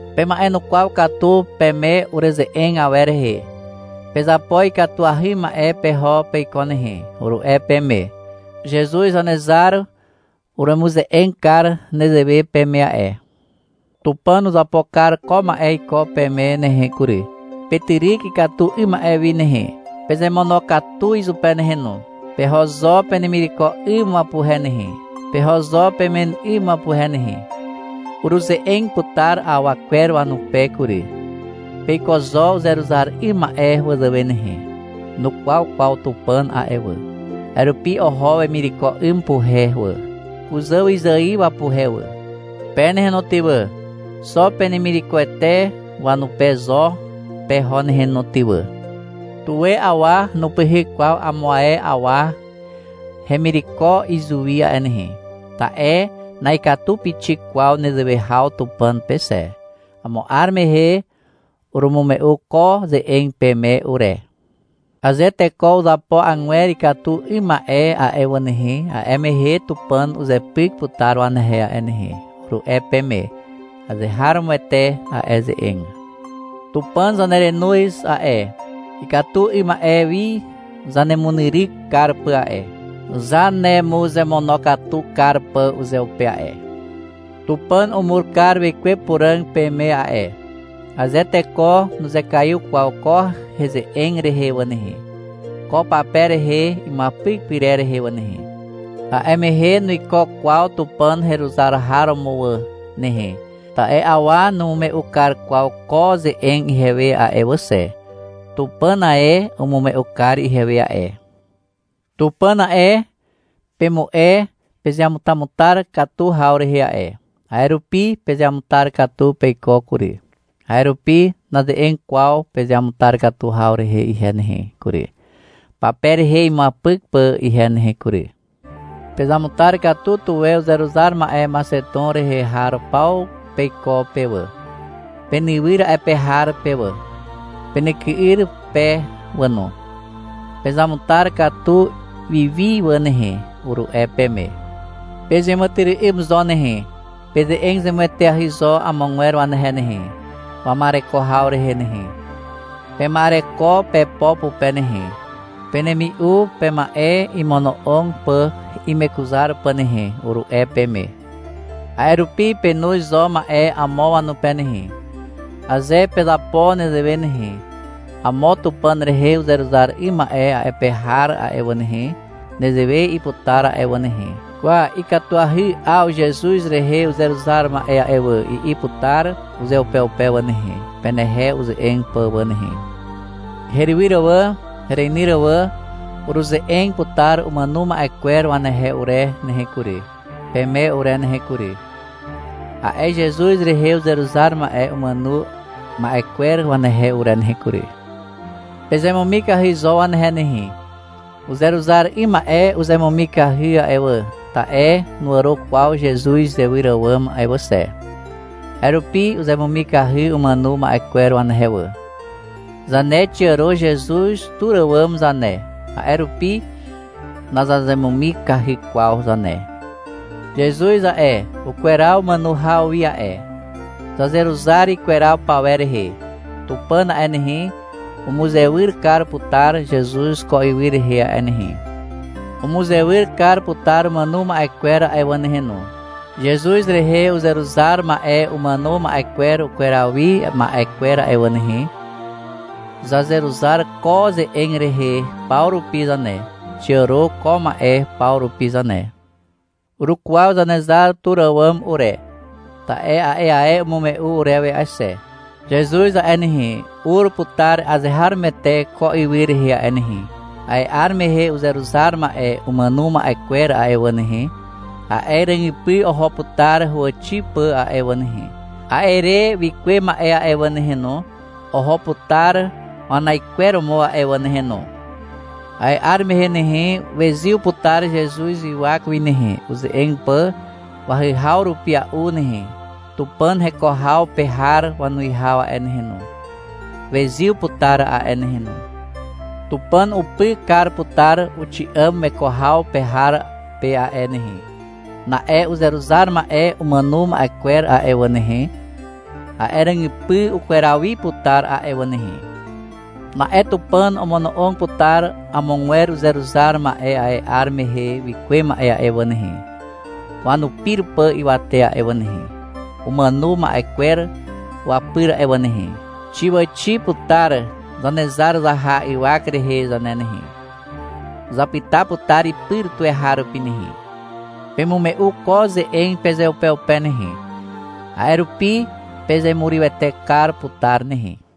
Pema'enukwaw katu peme ureze'eg awer rehe. — Pezapo ikatuahy ma'e peho peiko nehe, uru'e peme. Zezuz Zanezar uremuze'eg kar nezewe peme a'e. Tupàn uzapo kar ko ma'e iko peme nehe kury. Petyryk ikatu 'ym ma'e wi nehe. Pezemonokatu izupe nehe no. Peho zo penemireko 'ym wapuhe nehe. Peho zo pemen 'ym wapuhe nehe. Uruze'eg putar awa kwer wanupe kury. Peiko zo uzeruzar 'ym ma'e wazàwe nehe. Nukwaw kwaw Tupàn a'e wà. A'e rupi oho wemireko 'ym wapuhe wà, kuzàwyzài wapuhe wà. Pe nehe no ty wà, xo penemirekoete wanupe zo peho nehe no ty wà. Tuwe awa nupyhyk kwaw amo ae awa hemireko izuwi a'e nehe. Ta'e na'ikatu pixik kwaw nezewe haw Tupàn pe xe. Amo 'ar mehe urumume'u ko ze'eg peme ure. — Aze teko uzapo agwer ikatu 'ym ma'e a'e wà nehe, a'e mehe Tupàn uzepyk putar wanehe a'e nehe, uru'e peme. Azeharomoete a'e ze'eg. Tupàn zanerenoz a'e, ikatu 'ym ma'e wi zanemunyryk kar pà a'e, zanemuzemonokatu kar pà uzeupe a'e. Tupàn umur kar Wekwe Puràg peme a'e. Aze teko nuzekaiw kwaw ko heze'eg rehe wà nehe, ko pape rehe imuapyk pyrer rehe wà nehe, a'e mehe nuiko kwaw Tupàn heruzar har romo wà nehe, ta'e awa numume'u kar kwaw ko ze'eg ihewe a'e wà xe. Tupàn ae umume'u kar ihewe a'e. Tupàn a'e, pemu'e pezeamutamutar katu haw rehe a'e. A'e rupi pezeamutar katu peiko kury. A'e rupi naze'eg kwaw pezeamutar katu haw rehe ihe nehe kury, pape rehe imuapyk pà ihe nehe kury. Pezamutar katu tuwe uzeruzar ma'e Maxeton rehe har paw peiko pe wà, penywyr a'e pe har pe wà, penyky'yr pe wà no. — Pezamutar katu wiwi wà nehe, uru'e peme. — Pezeàmàtyry'ym zo nehe. Peze'eg zemueteahy zo amogwer wanehe nehe, wama'ereko haw rehe nehe. Pema'ereko pepo pupe nehe, penemi'u pema'e imono'og pà imekuzar pà nehe, uru'e peme. A'e rupi penoz zo ma'e amo wanupe nehe. Aze pezapo nezewe nehe, amo Tupàn rehe uzeruzar 'ym ma'e a'e pe har a'e wà nehe, nezewe i'i putar a'e wà nehe. — Kwa, ikatuahy 'aw Zezuz rehe uzeruzar ma'e a'e wà, i'i putar uzeupeupe wà nehe, penehe uze'eg pà wà nehe. Herywyr wà, hereinyr wà. Uruze'eg putar umàno ma'e kwer wanehe ure nehe kury, peme ure nehe kury, a'e Zezuz rehe uzeruzar ma'e umàno ma'e kwer wanehe ure nehe kury. Pezemumikahy zo wanehe nehe. Uzeruzar 'ym ma'e uzemumikahy a'e wà, ta'e nuàro kwaw Zezuz izewyr àwàm a'e wà xe. A'e rupi uzemumikahy umàno ma'e kwer wanehe wà. Zane xiàro Zezuz tur àwàm zane, a'e rupi nazazemumikahy kwaw zane. Zezuz a'e, ukweraw umàno haw wi a'e. Zazeruzar ikweraw pawer rehe. Tupàn a'e nehe, umuzewyr kar putar Zezuz ko ywy rehe a'e nehe. Umuzewyr kar putar umàno ma'e kwer a'e wà nehe no, Zezuz rehe uzeruzar ma'e umàno ma'e kwer ukweraw wi ma'e kwer a'e wà nehe. Zazeruzar ko ze'eg rehe paw rupi zane. Xiàro ko ma'e paw rupi zane. Urukwaw Zanezar tur àwàm ure. Ta'e a'e ae umume'u urewe a'e xe. Zezuz a'e nehe, ur putar azeharomoete ko ywy rehe a'e nehe. A'e 'ar mehe uzeruzar ma'e umàno ma'e kwer a'e wà nehe, a'e ràgypy oho putar huwàxi pà a'e wà nehe. A'e re wikuwe ma'e a'e wà nehe no, oho putar wanaikweromo a'e wà nehe no. A'e 'ar mehe nehe, wezyw putar Zezuz ywak wi nehe, uze'eg pà wahyhaw rupia'u nehe. Tupàn heko haw pe har wanuwihaw a'e nehe no, wezyw putar a'e nehe no. Tupàn upy kar putar uxi'àm weko haw pe har pe a'e nehe. Na'e uzeruzar ma'e umàno ma'e kwer a'e wà nehe, a'e ràgypy ukweraw wi putar a'e wà nehe. Na'e Tupàn omono'og putar amogwer uzeruzar ma'e a'e 'ar mehe wikuwe ma'e a'e wà nehe, wanupir pà ywate a'e wà nehe, umàno ma'e kwer wapyr a'e wà nehe. Xiàwàxi putar Zanezar zaha ywak rehe zane nehe. Zapyta putar ipyr tuweharupi nehe. Pemume'u ko ze'eg pezeupeupe nehe. A'e rupi pezemurywete kar putar nehe.